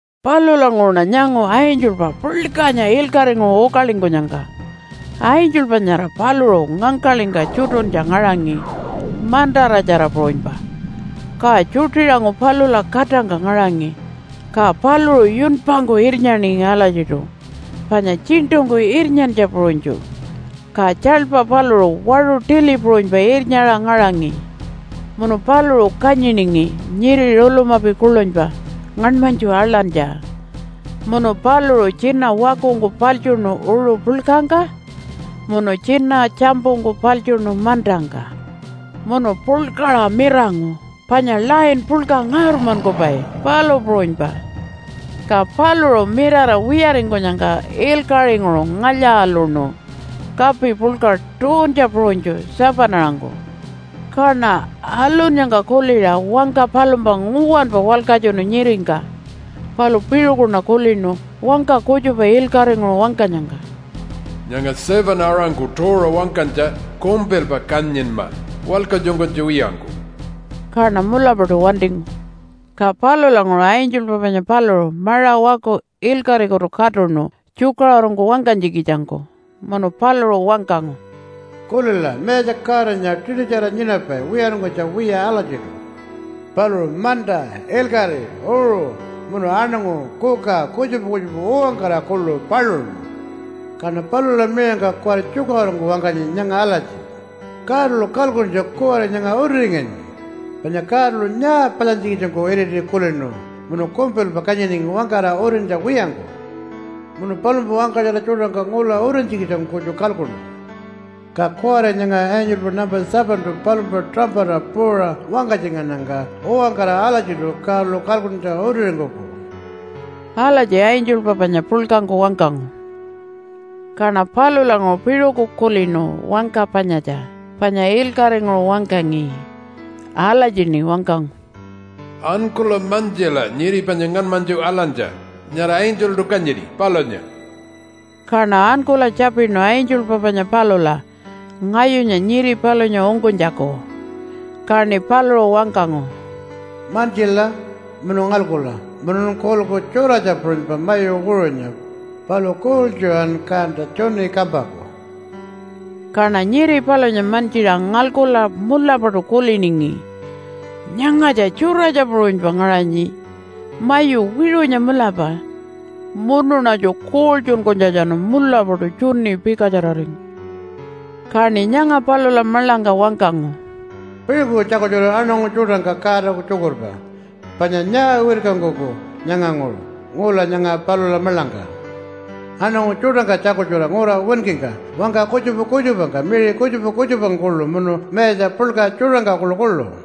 Palulanguṟuṉa nyangu angelpa puḻkanya ilkaṟinguṟu ukalingkunyangka. Angelpa nyara paluṟu ngangkaḻingka tjutuntja ngaṟangi mantaratjara puṟunypa, ka tjuṯiṟangu palula katangka ngaṟangi. Ka paluṟu yunpangku irnyaningi alatjiṯu, panya tjiṉṯungku irnyantja puṟunytju, ka tjaḻpa paluṟu waṟu tili puṟunypa irnyaṟa ngaṟangi. Munu paluṟu kanyiningi nyiri rulumapi kuḻunypa ngaṉmanytju aḻantja. Munu paluṟu tjina wakungku paḻtjuṉu uṟu puḻkangka munu tjina tjampungku paḻtjuṉu mantangka. Munu puḻkaṟa mirangu panya lion puḻka ngaurmankupai, palu puṟunypa. Ka paluṟu mirara wiyaringkunyangka ilkaṟinguṟu ngalya-aluṉu kapi puḻka tuuntja puṟunytju 7-aṟangku. Kaṉa alunnyangka kuliṟa wangka palumpa nguwanpa walkatjunu nyiringka. Palu piṟukuṉa kulinu wangka kutjupa ilkaṟinguṟu wangkanyangka, “Nyanga 7-aṟangku tuuṟa wangkanytja kumpilpa kanyinma walkatjunkunytja wiyangku!” Kaṉa mulapaṯu wantingu. Ka palulanguṟu angelpa panya paluṟu maṟa waku ilkaṟikutu katuṉu tjukaṟurungku wangkanytjikitjangku. Munu paluṟu wangkangu, “Kulila! Mayatja Godanya tiṯutjara nyinapai wiyaringkunytja wiya alatjiṯu. Paluṟu manta, ilkaṟi, uṟu munu aṉangu, kuka, kutjupa kutjupa uwankara kuḻu paluṉu. Kaṉa palula miṟangka kuwari tjukaṟurungku wangkanyi nyanga alatji, ‘Godalu kalkuntja kuwari nyanga utiringanyi. Panya Godalu nyaa palyantjikitjangku iriti kulinu, munu kumpilpa kanyiningi wangkara utintja wiyangku. Munu palumpa wangkatjara tjuṯangka ngula utintjikitjangku kutju kalkuṉu. Ka kuwari nyanga angelpa nampa 7-tu palumpa tuṟampata puuṟa wangkatjingannyangka uwankara alatjiṯu Godalu kalkuntja utiringkuku.’” Alatji angelpa panya puḻkangku wangkangu. Kaṉa palulanguṟu piṟuku kulinu wangka panyatja, panya ilkaṟinguṟu wangkangi. Alatjiṉi wangkangu, “Ankula mantjila nyiri panya ngaṉmanytju aḻantja nyara angeltu kanyini, palunya.” Kaṉa ankula tjapinu angelpa panya palula ngayunya nyiri palunya ungkunytjaku. Kaṉi paluṟu wangkangu, “Mantjila munu ngalkula! Munun kulilku tjuratja puṟunypa mayu wiṟunya, palu kuuḻtjuṟan kanta tjuni kampaku.” Kaṉa nyiri palunya mantjiṟa ngalkula mulapaṯu kuliningi, “Nyangatja tjuratja puṟunypa ngaṟanyi mayu wiṟunya mulapa.” Munuṉatju kuuḻtjunkunytjatjanu mulapaṯu tjuni pikatjararingu. Kaṉi nyanga palula maḻangka wangkangu, “Piṟuku tjakultjura aṉangu tjuṯangka Godaku tjukurpa panya nyaa wirkankuku nyanganguṟu ngula nyanga palula maḻangka. Aṉangu tjuṯangka tjakultjura ngura winkingka wangka kutjupa kutjupangka, miṟi kutjupa kutjupangka kuḻu, munu mayatja puḻka tjuṯangka kuḻukuḻu.”